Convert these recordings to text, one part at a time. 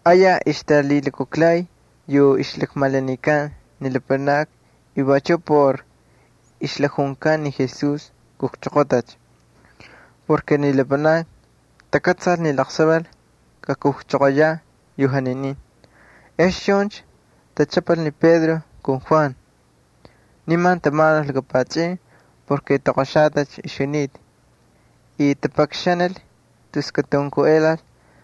Ayaj ixtalhilukujlhay yu ixlakmalanikan ni lapanakni y vachuꞌ por ixjalakjunkan ni Jesús kujchoqotacha y chuncha takꞌatsalcha ni laqsaval katakujchoqoyaꞌ yu janinin. Ex chuncha tachꞌapal ni Pedro ali Juan. Nimancha tamanul laka pachꞌin porke toqoxatacha ixjunita y tapakxanil tus katunkuꞌelal.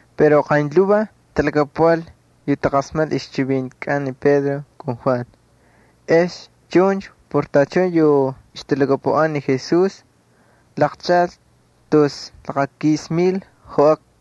Pero qaynlhuvaj talhakapuꞌal yu taqasmaknil ixchivintikꞌan ni Pedro ali Juan. Ex chuncha por tachun yu ixtalhakapuꞌan ni Jesús laqchaꞌal tus laqakis mil joꞌakna.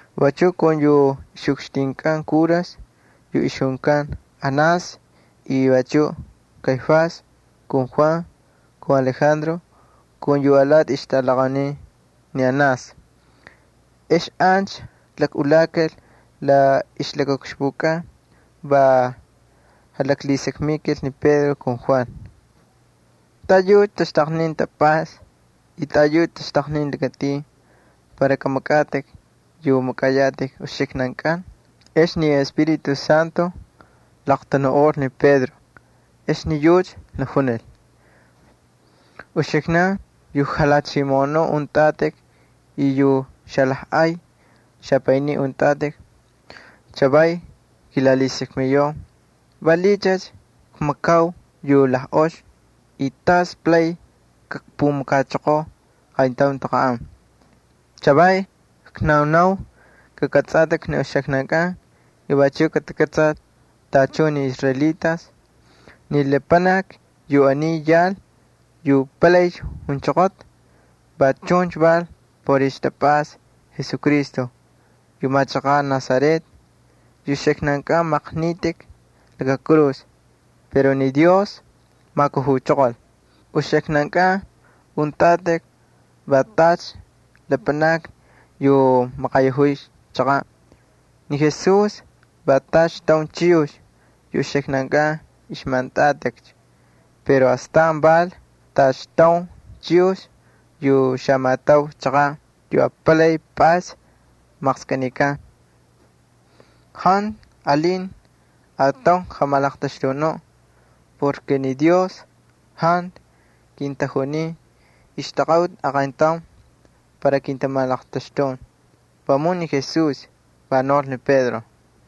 Vachuꞌ kun yu ixꞌukxtinkꞌan kuras yu ixjunkan Anás y vachuꞌ Caifás ali Juan ali Alejandro ali yu alati ixjatꞌalaqaunin ni Anás. Ex ancha jalakꞌulakal la ixlakaꞌukxpukꞌan, va jalaklhisakmikal ni Pedro ali Juan: —¿Taꞌayucha taxtaqnin tapꞌasta y taꞌayucha taxtaqnin lakatin para kamakꞌatꞌik yu makꞌayatꞌik uxiknankꞌan? Ex ni Espíritu Santo laqtanuꞌol ni Pedro, ex ni yucha jalakjunil: —Uxiknan yu jalhachimoꞌonun untꞌatꞌik, y yu xalajꞌay xapaynin untꞌatꞌik: chavaycha kilalhisakmiyau valiꞌiycha kmakau yu la ox y tas palaycha kpumakachoqoo qayntaun taqanꞌan. Chavaycha knaunau kakꞌatsꞌatꞌik ni uxiknankꞌan y vachuꞌ katakꞌatsal tachun ni israelitas, ni lapanaki yu aniy yal yu palaycha junchoqota va chuncha val por ixtapꞌasta Jesucristo yu machaqaꞌ Nazaret yu uxiknan maqnitꞌik laka kurus pero ni Dios majkujuchoqol. Uxiknankꞌan untꞌatꞌik va tacha lapanakni yu tamaqayajuy chaqaꞌ. Ni Jesús va tacha taun chiyux yu uxiknankꞌan ixmajꞌantꞌatꞌikcha pero astan val tacha taun chiyux yu xamatau chaqaꞌ, yu apalay pꞌays maqskꞌinikan. Jantu alin ataun jamalaqtaxtunuꞌ porke ni Dios jantu kintajunin ixtaqaꞌuti aqayntaun para kintamalaqtaxtun, vamun ni Jesús —va naul ni Pedro.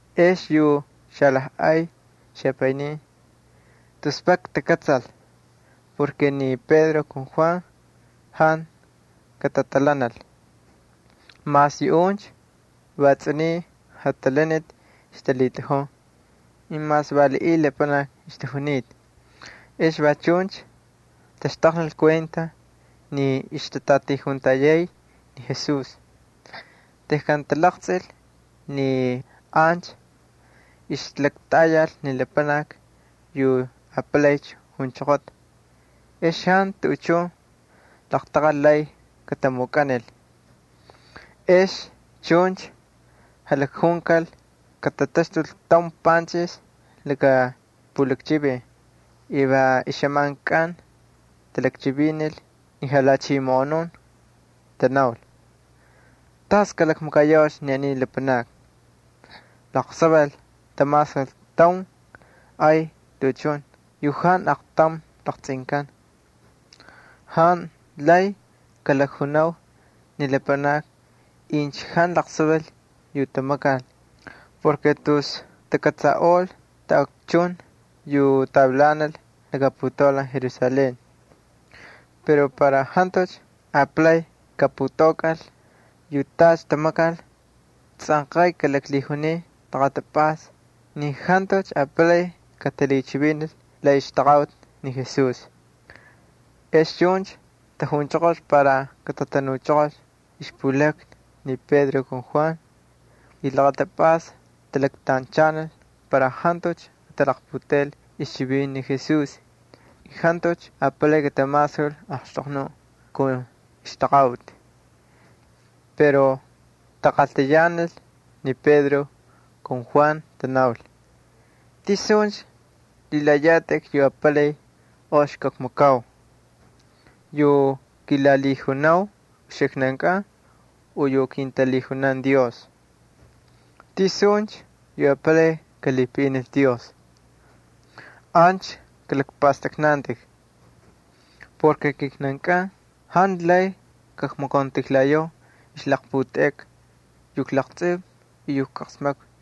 Ex yu xalajꞌay xapaynin tus vak takꞌatsal porke ni Pedro ali Juan jantu katatalhanal, mas yuꞌuncha va tsꞌuniy jatalaniti ixtalhitꞌajun y mas valiꞌiy lapanakni ixtajunita. Va chuncha taxtaqnil kuenta ni Pedro ali Juan va ixtatꞌatijuntayay ni Jesús. Tejkan talaqtsꞌil ni ancha ixlaktꞌayal ni lapanaki yu palaycha ixjunchoqota ex jantu tuꞌuchun laqtaqal lay kamukꞌanikal. Ex chuncha jalakjunkal katataxtul taun panchꞌix laka pulakchivin y xꞌamankꞌan talakchivinil ni lhachimoꞌonun. Tanaul: —¿Tas kalakmakayaucha ni aniy lapanakni? Laqsaval tamasul taun ay tuꞌuchun yu jantu aqtaun laqtsꞌinkan. Jantu lay junau ni lapanakni incha jantu laqsaval yu tamakal porke tus takꞌatsaꞌol taꞌakchun yu tavilanal laka putaulan Jerusalén. Pero para jantucha apalay kaputaukꞌal yu tacha tamakal, tsꞌanqay kalaklhijuniu laqatapꞌasta ni jantucha apalay katalhichivinil la ixtaqaꞌuti ni Jesús. Ex chuncha tajunchoqol para katatanuchoqolcha ixpulakna ni Pedro ali Juan, y laqatapꞌasta talaktanchanil para jantucha katalaqputeꞌel ixchivinti ni Jesús y jantucha apalay katamasul axtoqnuꞌ kun ixtaqaꞌuti. Pero taqaltayanal ni Pedro ali Juan, tanaul: —¿Tisuncha lhilayatꞌik yu apalay ox kakmakau? ¿Yu kilalhijunau uxiknankꞌan u yu kintalhijunan Dios? ¿Tisuncha yu apalay kalhipaꞌinil Dios? Ancha kalakpꞌastꞌaknantꞌik. Ni kijnankꞌan jantu lay kmakauntijlayau ixlaqputeꞌeka yu klaqtsꞌiu y yu ijqasmakvi.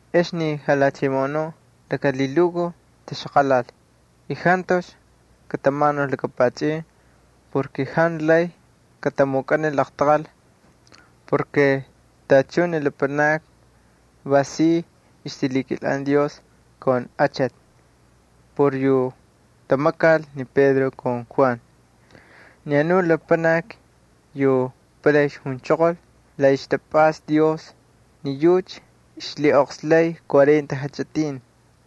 Ex ni lhachimoꞌonun laka lhilukuj taxaqalal y jantucha katamanul laka pachꞌin. Jantu lay katamukꞌanil laqtaqal porke tachun ni lapanakni va si ay ixtamakay Dios kun achati por yu tamakal ni Pedro ali Juan. Ni anu lapanaki yu palay junchoqol la ixtapꞌasta Dios, ni yucha ixlhiꞌoqslaycha cuarenta ixjachꞌitin.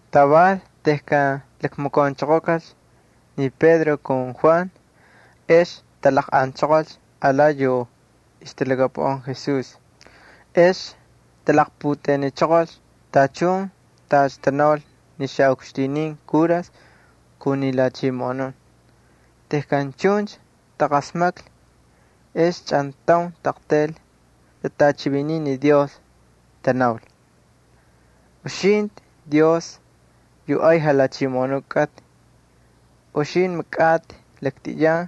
Taval tejkan lakmakaunchoqokalcha ni Pedro ali Juan ex talaqꞌanchoqolcha alati yu ixtalhakapuꞌan Jesús. Ex talaqputeꞌeniꞌochoqol tachun tacha tanaul ni xaꞌukxtinin kuras kun ni lhachimoꞌonun. Tejkan chuncha taqasmaklhi ex chꞌantaun taꞌaqtayl tatꞌachiviniy ni Dios. Tanaul: —Uxintꞌi Dios yu ay Jalhachimoꞌonuꞌ kꞌatꞌi, uxintꞌi makꞌatꞌi laktꞌiyan,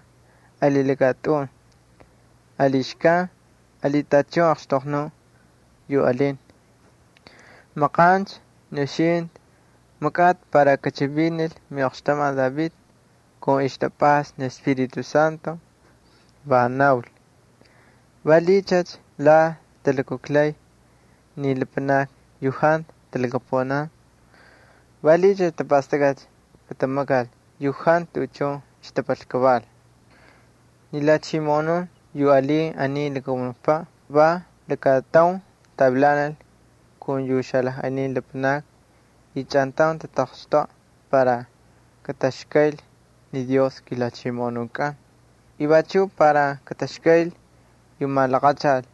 ali lakatꞌun, ali xkan ali tachun axtoqnuꞌ yu alinta. Maqancha ni uxintꞌi makꞌatꞌi para kachivinil miꞌoqxtamati David kun ixtapꞌasta miꞌEspíritu Santo, va naul: ¿Valiꞌiycha la talukujlaycha ni lapanakni yu jantu talhakapuꞌan? ¿Valiꞌiycha tapastakꞌacha katamakal yu jantu tuꞌuchun ixtapal kaval? Ni jalhachimoꞌonun yu alin aniy lakamunukpaꞌ va lakataun tavilanal kun yu xalajꞌay lapanakni y chꞌantaun tataqxtoꞌa para kataxkayl ni Dios kiJalhachimoꞌonukꞌan y vachuꞌ para kataxkayl yu malaqachal.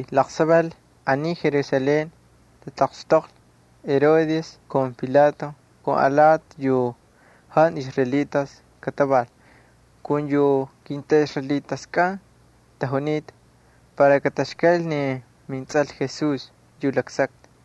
’Laqsaval aniy Jerusalén tataqxtoqlhi Herodes kun Pilato kun alati yu jantu israelitas kataval kun yu kintꞌaꞌisraelitas tajunita para kataxkayl ni minTsꞌal Jesús yu laksaktꞌi.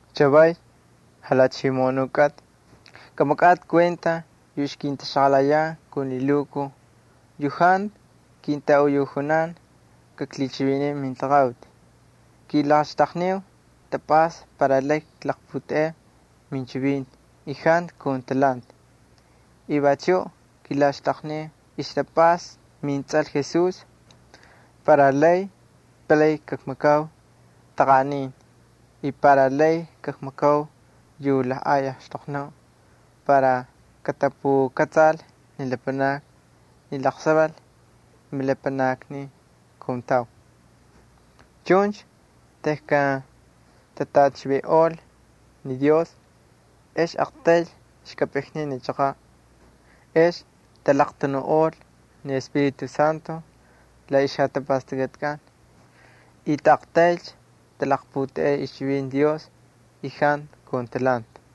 Chavaycha, Jalhachimoꞌonuꞌ kꞌatꞌi, kamakꞌatꞌi kuenta yu ixkintaxaqalayan kun lhilukuj yu jantu kintaꞌuyujjunan kaklhichiviniu mintaqaꞌuti. Kilaxtaqniu tapꞌasta para lay kaklaqputeꞌeu minchivinti y jantu kun talhanti. Vachuꞌ kilaxtaqniu ixtapꞌasta minTsꞌal Jesús para lay palay kakmakau taqanꞌanin y para lay kakmakau yu lajꞌay axtoqnuꞌ para katapukꞌatsal ni lapanakni ni laqsaval milapanakni kuntau. Chuncha tejkan tatꞌachivinꞌol ni Dios ex aqtayl xkapꞌiknin ni chaqaꞌ. Ex talaqtanuꞌol ni Espíritu Santo la ixjatapastakꞌatikꞌan y taꞌaqtaylcha talaqputeꞌey ixchivinti Dios y jantu kun talhanti.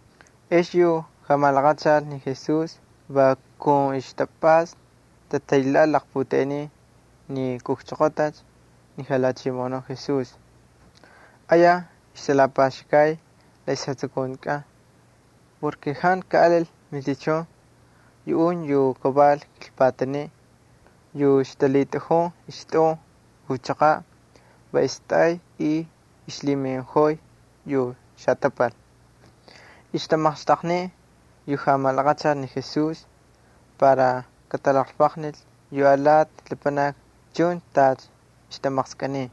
Ex yu jamalaqachal ni Jesús va kun tapꞌasta tataylhaꞌal laqputeꞌenin ni ixkujchoqotacha ni Jalhachimoꞌonuꞌ Jesús. Ayaj ixtalapaxkay la ixjatsukuntikꞌan porke jantu kaꞌalil matichun yu kaval kilpataniꞌ. Yu ixlhitꞌajun ixtꞌun u ixchaqaꞌ va istꞌay y ixlhiminꞌojoy yu xatapal. Ixtamaqxtaqniy yu jamalaqachal ni Jesús para katalaqlvaqnil yu alati lapanakni chuncha tacha ixtamaqskꞌiniy.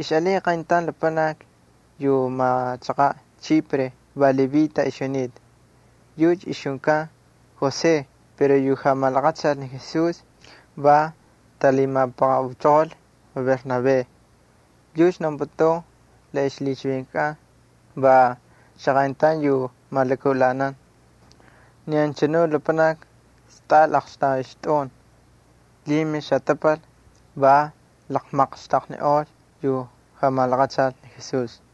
Ixꞌalin qayntaun lapanaki yu machaqaꞌ Chipre va Levita ixjunita. Yucha ixjunkan José pero yu jamalaqachal ni Jesús va talhimapaqaꞌuchoqol va Bernabé, yucha naunputun la ixlhichivinkꞌan va xaqayntaun yu malakaꞌulanan. Ni anchanu lapanaki stꞌal aqxtaun ixtꞌun, lhimil xatapal, va laqmaqxtaqniꞌol yu jamalaqachal ni Jesús.